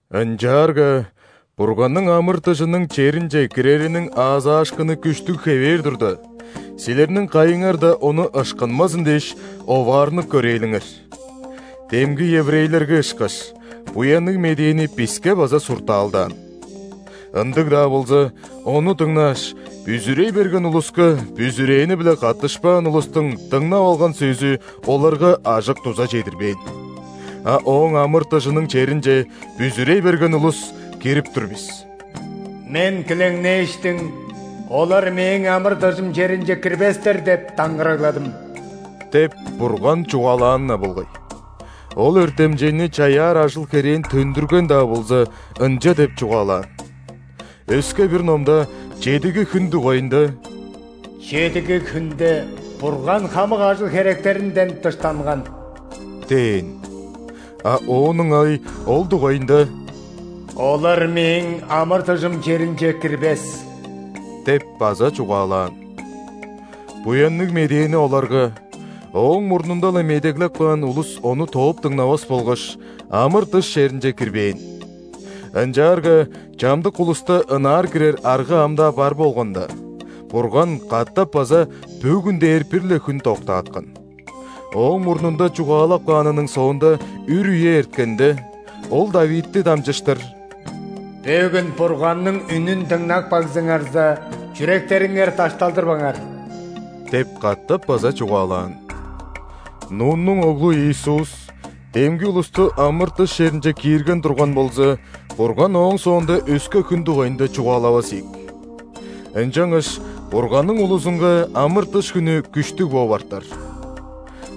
Ынчаарга Бурганның амыр-дыжының черинче кирериниң аазаашкыны күштүг хевээр турда, силерниң кайыңар-даа ону ышкынмазын дээш, оваарнып көрээлиңер. Демги еврейлерге ышкаш, Буянныг медээни биске база суртаалдаан. Ындыг-даа болза, ону дыңнааш, бүзүрей берген улуска бүзүрээни-биле каттышпаан улустуң дыңнап алган сөзү оларга ажык-дуза чедирбээн. А Ооң амыр-дыжының черинче бүзүрей берген улус кирип тур бис.«Мен килеңнээштиң: „Олар Мээң амыр-дыжым черинче кирбестер“ –деп даңгырагладым» – деп, Бурган чугаалаан-на болгай. Ол өртемчейни чаяар ажыл-херээн төндүрген-даа болза, ынча деп чугаалаан. Өске-бир Номда чедиги хүн дугайында:«Чедиги хүнде Бурган хамык ажыл-херектеринден дыштанган» – дээн. А оон ыңай ол дугайында:«Олар Мээң амыр-дыжым черинче кирбес» – деп база чугаалаан. Буянныг медээни оларга ооң мурнунда-ла медеглеп каан улус ону тооп дыңнавас болгаш, амыр-дыш черинче кирбээн. Ынчаарга чамдык улуста ынаар кирер арга ам-даа бар болганда, Бурган катап база «бөгүн» дээр бир-ле хүн доктааткан. Ооң мурнунда чугаалап каанының соонда үр үе эрткенде, Ол ·Давидти дамчыштыр: «Бөгүн, Бурганның үнүн дыңнап кагзыңарза, чүректериңер дашталдырбаңар» – деп катап база чугаалаан. Нуннуң оглу Иисус демги улусту амыр-дыш черинче киирген турган болза, Бурган ооң соонда өске хүн дугайында чугаалавас ийик. Ынчангаш Бурганның улузунга амыр-дыш хүнү күштүг бооп артар.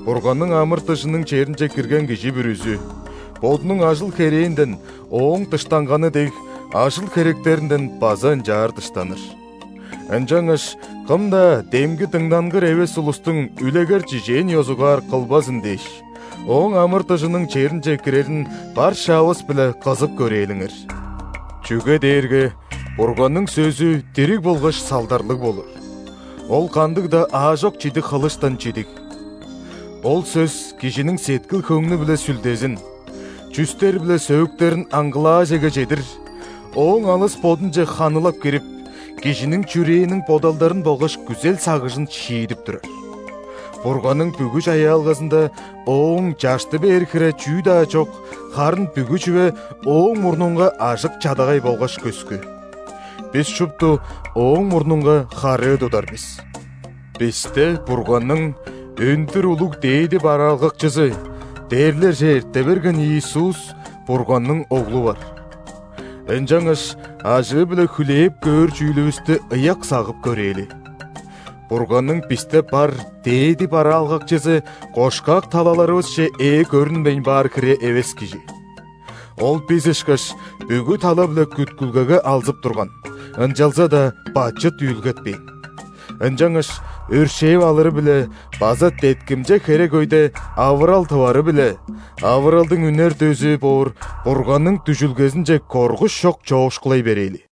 Бурганның амыр-дыжының черинче кирген кижи бүрүзү, Бодунуң ажыл-херээнден Ооң дыштанганы дег, ажыл-херектеринден база ынчаар дыштаныр. Ынчангаш кым-даа демги дыңнангыр эвес улустуң үлегер-чижээн ёзугаар кылбазын дээш, Ооң амыр-дыжының черинче кирерин бар шаавыс-биле кызып көрээлиңер. Чүге дээрге Бурганның сөзү дириг болгаш салдарлыг болур, ол кандыг-даа аажок чидиг хылыштан чидиг. Ол сөс кижиниң сеткил-хөңнү биле сүлдезин, чүстер биле сөөктерин аңгылаажеге чедир, ооң алыс бодунче ханылап кирип, кижиниң чүрээниң бодалдарын болгаш күзел-сагыжын шиидип турар. Бурганның бүгү чаяалгазында Оон чашты бээр хире чүү-даа чок, харын бүгү чүве Ооң мурнунга ажык-чадагай болгаш көскү. Бис шупту Ооң мурнунга харыы тудар бис. Бисте Бурганның өндүр улуг дээди бараалгакчызы – дээрлерже эрте берген Иисус, Бурганның Оглу бар. Ынчангаш ажыы-биле хүлээп көөр чүүлүвүстү ыяк сагып көрээли. Бурганның бисте бар дээди бараалгакчызы кошкак талаларывысче ээ көрүнмейн баар хире эвес Кижи. Ол, бис ышкаш, бүгү тала-биле күткүлгеге алзып турган, ынчалза-даа бачыт үүлгетпээн. Ынчангаш өршээл алыры-биле база деткимче херек өйде авырал тывары-биле, авыралдың үнер дөзү боор Бурганның дүжүлгезинче коргуш чок чоокшулай берээли.